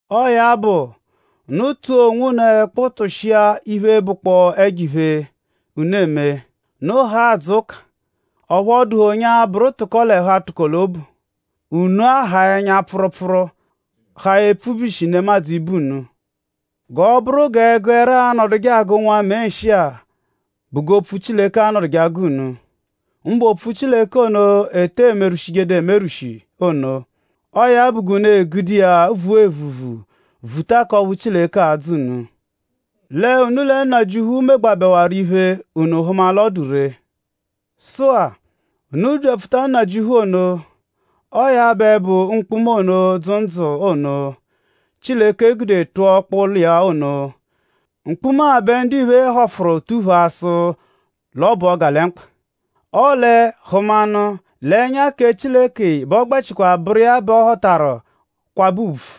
Ọo ya bụ; unu tụa onwunu ẹkpu tụshia iphe, bụkpoo ẹjo-iphe, unu eme. Unu haa adzụ ụka; ọphu ọ dụhe onye a-bụru tụko-l'ẹhu-atụko-l'obu; unu ahaa ẹnya-pfụrupfuru; haa epfubyishi nemadzụ ibe unu. G'ọ bụru g'ẹgu ẹra l'anọduje agụ nwamee nshị-a bụ g'opfu Chileke anọduje agụ unu; mbụ opfu Chileke ono, e te emerwụshiduru emerwụshi ono; ọo ya bụ g'unu e-gude iya vua evuvu; vuta k'ọphu Chileke a-dzọ unu. Lẹ unu lẹ Nnajịuphu megbabẹwaru iphe; unu hụma l'ọ dụ ree. Sụ-a; unu byapfuta Nnajịuphu ono. Ọo ya bẹ bụ mkpuma ono, dzụ ndzụ ono, Chileke gude tụa ọkpa ụlo iya ono. Mkpuma-a bẹ ndiphe họfuru tuphaa sụ l'ọ bụ ọgalemkpa. Ọle hụmanu; l'ẹnya kẹ Chileke bẹ ọ gbẹchikwa bụru iya bẹ ọ họtaru kwabẹ ùbvù.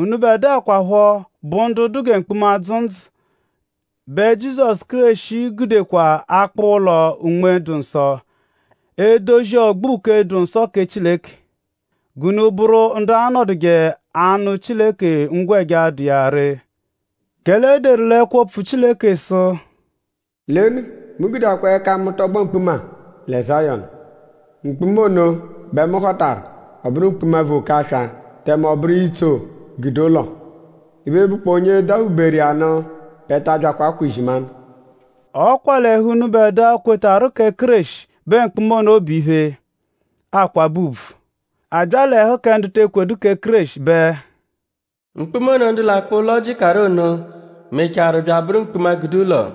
Unubẹdua kwaphọ, bụ ndu dụ gẹ mkpuma, dzụ ndzụ; bẹ Jizọsu Kéreshi gudekwa akpụ ụlo Unme-dụ-Nsọ; edozi ọgbo uke, dụ nsọ kẹ Chileke. G'unu bụru ndu a-nọduje anụ Chileke ngwẹja, dụ iya ree. Kẹle e deru l'ẹkwo-opfu Chileke sụ: “Lenu; mu gudeakwa ẹka mu tọgbo mkpuma lẹ Zayọnu. Mkpuma ono bẹ mu họtaru; ọ bụru mkpuma vu oke-aswa; tẹme ọ bụru itso gude ụlo. Iphe, bụkpoo onye daphuberu iya nụ bẹ ta abyakwa akwa izimanụ.” Ọ kwa l'ẹhu k'unubẹdua, kwetarụ kẹ Kéreshi bẹ mkpuma ono bụ iphe, akwabẹ ùbvù; a bya l'ẹhu kẹ ndu te ekwedu kẹ Kéreshi bẹ; “Mkpuma ono, ndu l'akpụ ụlo jịkaru ono mechaarụ bya abụru mkpuma, gude ụlo.”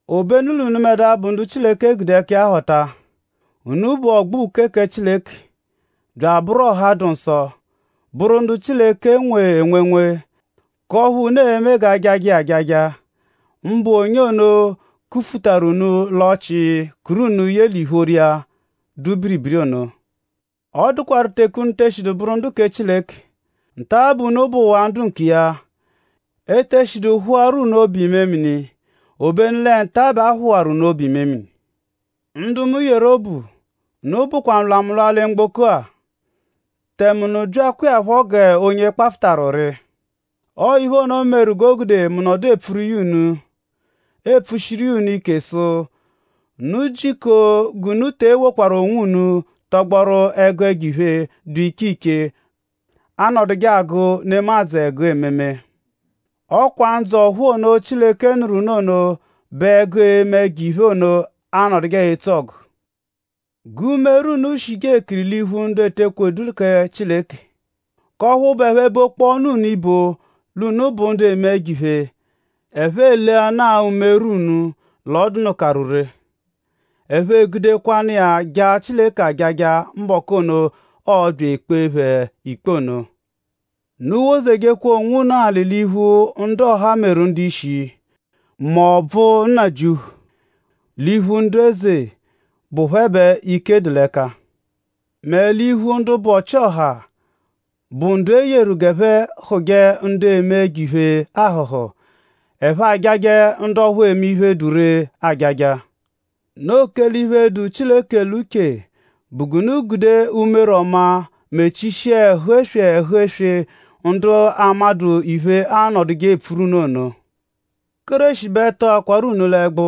Obenu l'unubẹdua bụ ndu Chileke gude ẹka iya họta. Unu bụ ọgbo uke kẹ Chileke; bya abụru ọha dụ nsọ; bụru ndu Chileke nwe enwenwe; k'ọphu unu e-me g'ajajẹ iya ajaja; mbụ onye ono kufutaru unu l'ọchii kuru unu ye l'ìphóró iya, dụ biribiri ono. Ọ dụkwaru teke unu eshidu bụru ndu kẹ Chileke; nta-a bẹ unu bụwaa ndu nkiya. Ete shidu phụaru unu obu-imemini; obenu lẹ nta-a bẹ ọ phụwaru unu obu-imemini. Ndu mu yeru obu; unu bụkwa nlwamụlwa lẹ mgboko-a; tẹme unu byakwa iya phọ g'onye kpafụtaru ụri. Ọo iphe ono meru g'o gude mu nọdu epfuru iya unu; epfushiru iya unu ike sụ unu jiko g'unu te ewokwaru onwunu tọgboru ẹgu ẹjo-iphe, dụ iche iche, anọduje agụ nemadzụ ẹgu ememe. Ọ kwa ndzụ ọ̀phúú ono, Chileke nụru unu ono bẹ ẹgu eme ẹjo-iphe ono anọduje etso ọgu. G'umere unu shije ekiri l'iphu ndu ete ekwedu kẹ Chileke; k'ọphu bụ ẹphe -bokpọonu unu ibo l'unu bụ ndu eme ẹjo-iphe; ẹphe eleanaa umere unu l'ọ dụnukaru ree; ẹphe egudekwanụ iya jaa Chileke ajaja mbọku ono, ọo-bya ekpee phẹ ikpe ono. Unu wozejekwa onwunu alị l'iphu ndu ọha meru ndu-ishi; m'ọbvu Nnajịuphu; l'iphu ndu-eze, bụ phẹ bẹ ike dụ l'ẹka; mẹ l'iphu ndu bụ ọ-chị-ọha, bụ ndu e yeru g'ẹphe hụ̀je ndu eme ẹjo-iphe ahụ̀hù; ẹphe ajajẹ ndu ọphu eme iphe, dụ ree ajaja. Noo kẹle iphe, dụ Chileke l'uche bụ g'unu gude umere ọma mechishia ẹhu-eswe ẹhu-eswe ndu amadụ iphe anọduje epfuru unu ono. Kéreshi bẹ tọakwaru unu l'ẹgbu.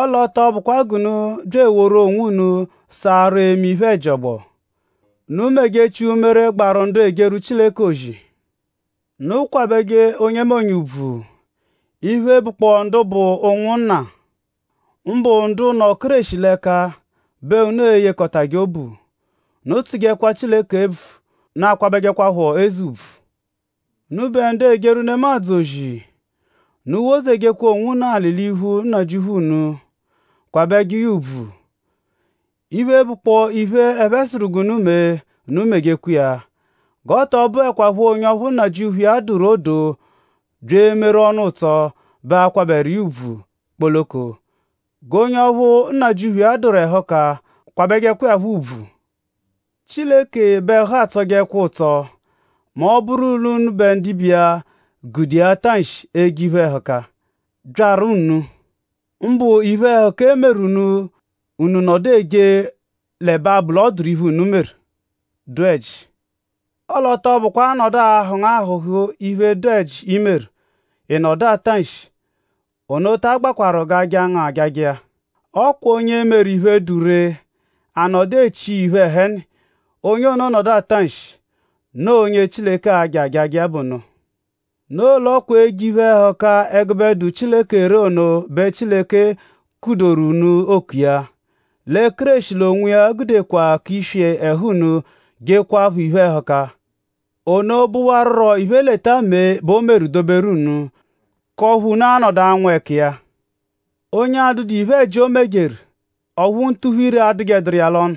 Ọle ọ tọ bụkwa g'unu bya eworu onwunu saarụ eme iphe-ẹji ọgbo. Unu mejechia umere, gbaru ndu ejeru Chileke ozi. Unu kwabẹje onyemonye ùbvù. Iphe, bụkpoo ndu bụ ụnwunna; mbụ ndu nọ Kéreshi l'ẹka; bẹ unu eyekọtaje obu. Unu tsụjekwa Chileke ebvu. Unu akwabẹjekwapho eze ùbvù. Unubẹ ndu ejeru nemadzụ ozi; unu wozejekwa onwunu alị l'iphu nnajịuphu unu; kwabẹje iya ùbvù. Iphe, bụkpoo iphe, ẹphe sụru g'unu mee; unu mejekwa iya. G'ọ tọ bụekwapho onye ọphu nnajịuphu iya dụru odoo bya emeru ọnu ụtso bẹ a-kwabẹje iya ùbvù kpoloko. G'onye ọphu nnajịuphu iya dụru ẹhuka kwabẹjekwa iya phọ ùbvù. Chileke bẹ ẹhu atsọjekwa ụtso mẹ ọ -bụru l'unubẹ ndibe iya gude iya ata nshi eje iphe-ẹhuka, byaru unu; mbụ iphe-ẹhuka, e meru unu; unu nọdu eje l'ẹbe abụ l'ọ dụru iphe, unu meru, dụ ẹji. Ọle ọ tọ bụkwa: a -nọdu ahụ̀ ngu ahụ̀hù iphe, dụ ẹji, i meru ị nọdu ata nshi; ono ta agbakwarụ g'a jaa ngu ajaja iya. Ọ kwa onye meru iphe, dụ ree; a nọdu echi iya iphe ẹheni; onye ono nọdu ata nshi; noo onye Chileke a-ja ajaja iya bụ ono. Noo l'ọ kwa eje iphe-ẹhuka ẹgube dụ Chileke ree ono bẹ Chileke kudoru unu oku iya. Lẹ Kéreshi l'onwiya gudekwa k'iswi ẹhu unu jekwaaphọ iphe-ẹhuka. Ono bụwaruro iphe-leta-mee bẹ o meru doberu unu; k'ọphu unu a-nọdu anwụ ẹka iya. “Onye adụdu iphe-ẹji, o mejeru; ọphu ntuphu-ire adụjeduru iya l'ọnu.”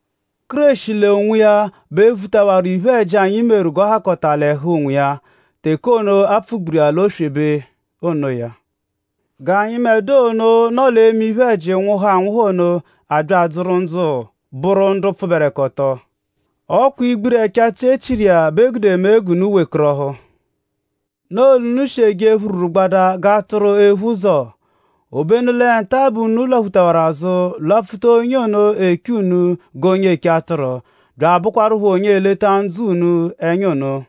Kéreshi l'onwiya bẹ vutawaru iphe-ẹji, anyi meru g'ọ hakọta l'ẹhu onwiya teke ono, a pfugburu iya l'oswebe onoya. G'anyịbedua ono, nọ l'eme iphe-ẹji nwụhu anwụhu ono abya adzụru ndzụ bụru ndu pfụberekoto. Ọ kwa igbiri ẹchachi e chiru iya bẹ e gude mee g'unu wekọrohu. Noo l'unu shi eje phururugbadaa g'atụru, ephu ụzo; obenu lẹ nta-a bẹ unu lwaphutawaru azụ; lwapfuta onye ono, eche unu g'onye eche atụru; bya abụkwarupho onye eleta ndzụ unu ẹnya ono.